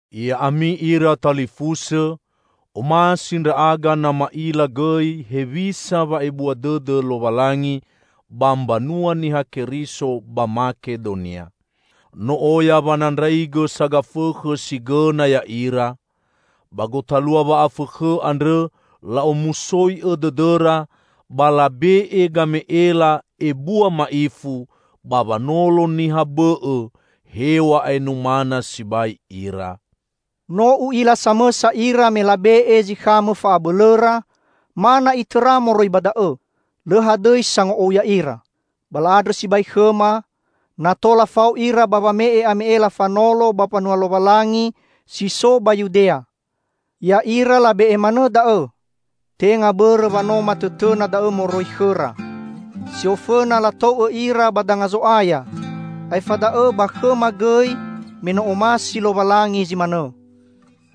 Ya'ami ira talifusõ, omasi ndra'aga na ma'ila gõi hewisa wa'ebua dõdõ Lowalangi ba mbanua Niha Keriso ba Makedonia. No oya wanandraigõ sagafõkhõ si gõna ya'ira! Ba gotalua wa'afõkhõ andrõ, la'omusoi'õ dõdõra ba labe'e game'ela, ebua ma'ifu, ba wanolo niha bõ'õ, hew̃a'ae numana sibai ira. No u'ila samõsa ira me labe'e zi khamõ fa'abõlõra, ma na'i tõra moroi ba da'õ. Lõ hadõi sango'ou ya'ira. Ba la'andrõ sibai khõma na tola fao ira ba wame'e ame'ela fanolo ba mbanua Lowalangi si so ba Yudea. Ya'ira labe'e manõ da'õ, tenga bõrõ wa no matõtõna da'õ moroi khõra. Si ofõna latou'õ ira ba danga Zo'aya, aefa da'õ ba khõma gõi me no omasi Lowalangi zi manõ.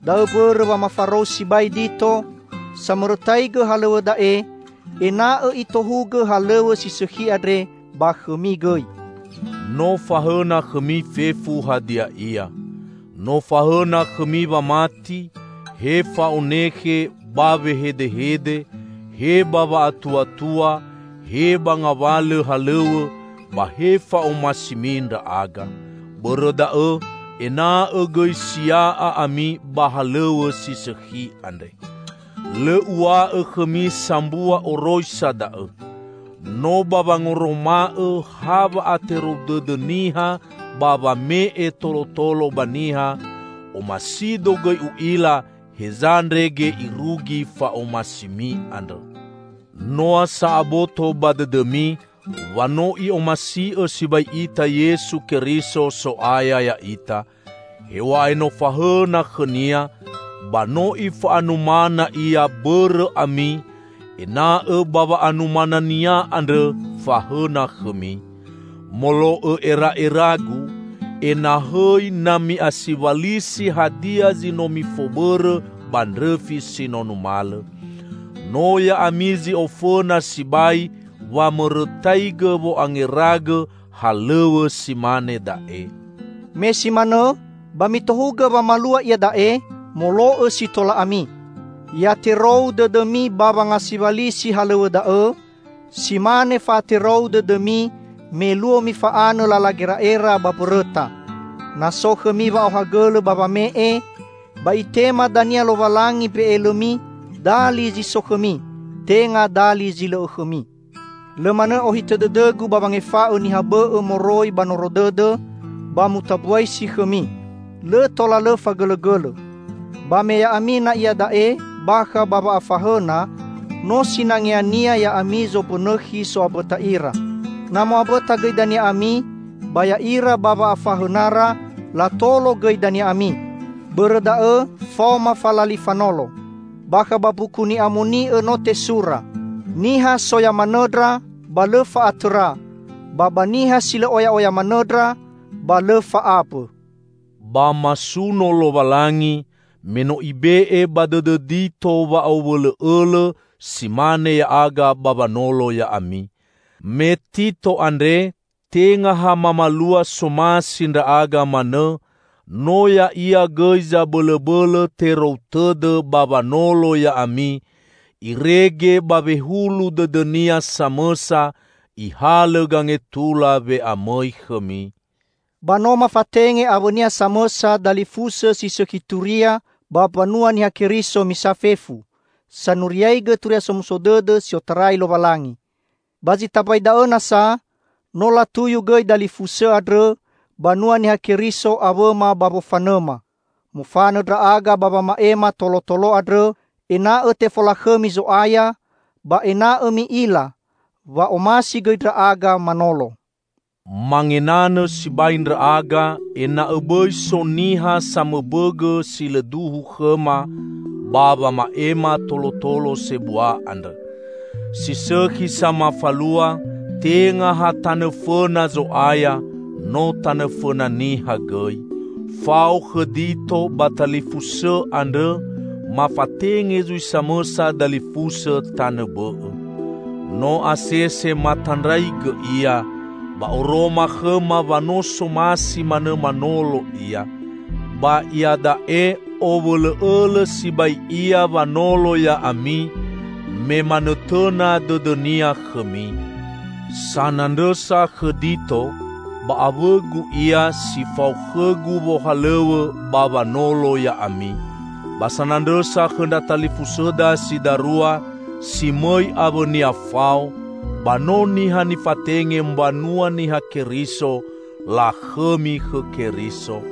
Da'õ mbõrõ wa mafarou sibai Dito -- samõrõtaigõ halõw̃õ da'e -- ena'õ itohugõ halõw̃õ si sõkhi andre ba khõmi gõi. No fahõna khõmi fefu hadia ia. No fahõna khõmi wamati, he fa'onekhe ba wehedehede, he ba wa'atuatua, he ba ngawalõ halõw̃õ, ba he fa'omasimi ndra'aga. Bõrõ da'õ, ena'õ gõi sia'a ami ba halõw̃õ si sõkhi andre. Lõ uw̃a'õ khõmi sambua oroisa da'õ. No ba wangoroma'õ ha wa'aterou dõdõ niha ba wame'e tolotolo ba niha, omasido gõi u'ila heza ndrege irugi fa'omasimi andrõ. Noa sa aboto ba dõdõmi wa no I'omasi'õ sibai ita Yesu Keriso, So'aya ya'ita: Hew̃a'ae no fahõna khõ-Nia, ba no Ifa'anumana Ia bõrõ ami, ena'õ ba wa'anumana-Nia andrõ, fahõna khõmi. Molo'õ era'eragu, enahõi na mi'asiwalisi hadia zi no mifobõrõ ba ndrõfi si no numalõ. No ya'ami zi ofõna sibai wamõrõtaigõ wo'angeragõ halõw̃õ si mane da'e. Me si manõ, ba mitohugõ wamalua iada'e, molo'õ si tola ami. Ya terou dõdõmi ba wangasiwalisi halõw̃õ da'õ, si mane fa'aterou dõdõmi me luo mifa'anõ lala gera'era ba mbõrõta. Na so khõmi wa'aohagõlõ ba wame'e, ba Itema dania Lowalangi mbe'elõmi dali zi so khõmi, tenga dali zi lõ'õ khõmi. Lõ manõ ohitõ dõdõgu ba wangefa'õ niha bõ'õ moroi ba noro dõdõ, ba mutambuasi khõmi. Lõ tola lõ fagõlõgõlõ. Ba me ya'ami na iada'e bakha ba wa'afahõna, no sinangeania ya'ami zombõnõkhi so'ambõta ira. Na mo'ambõta gõi dania ami, ba ya'ira, ba wa'afahõnara, latolo gõi dania ami. Bõrõ da'õ faoma falali fanolo. Bakha ba Mbuku Ni'amoni'õ no tesura, "Niha soya manõndra, ba lõ fa'atõra, ba ba niha si lõ oya'oya manõndra, ba lõ fa'ambõ." Ba masuno Lowalangi, me no Ibe'e ba dõdõ Dito wa'owõlõ'õlõ si mane ya'aga ba wanolo ya'ami. Me Tito andre tenga ha mamalua somasi ndra'aga manõ, no ya'ia gõi zabõlõbõlõ terou tõdõ ba wanolo ya'ami, irege ba wehulu dõdõnia samõsa ihalõ gangetula we'amõi khõmi. Ba no mafatenge awõnia samõsa dalifusõ si sõkhi turia ba mbanua Niha Keriso misa fefu, sanuriaigõ Turia Somuso Dõdõ si otarai Lowalangi. Ba zi tambai da'õ nasa, no latuyu gõi dalifusõ andrõ banua Niha Keriso awõma ba wofanõma. Mofanõ ndra'aga ba wama'ema tolotolo andrõ, ena'õ tefolakhõmi Zo'aya, ba ena'õ mi'ila wa omasi gõi ndra'aga manolo. Mangenanõ sibai ndra'aga ena'õ bõi so niha samõbõgõ si lõ duhu khõma, ba wama'ema tolotolo sebua andrõ. Si sõkhi sa mafalua, tenga ha tanõ fõna Zo'aya, no tanõ fõna niha gõi. Fao khõ Dito ba talifusõ andrõ, mafatenge zui samõsa dalifusõ tanõ bõ'õ. No asese matandraigõ ia, ba oroma khõma wa no somasi manõ manolo ia. Ba iada'e, owõlõ'õlõ sibai ia wanolo ya'ami, me manõtõna dõdõnia khõmi. Sanandrõsa khõ Dito, ba awõgu ia, si fao khõgu wohalõw̃õ ba wanolo ya'ami. Ba sanandrõsa khõ ndra talifusõda si darua, si mõi awõnia fao, ba no niha nifatenge mbanua Niha Keriso -- lakhõmi khõ Keriso.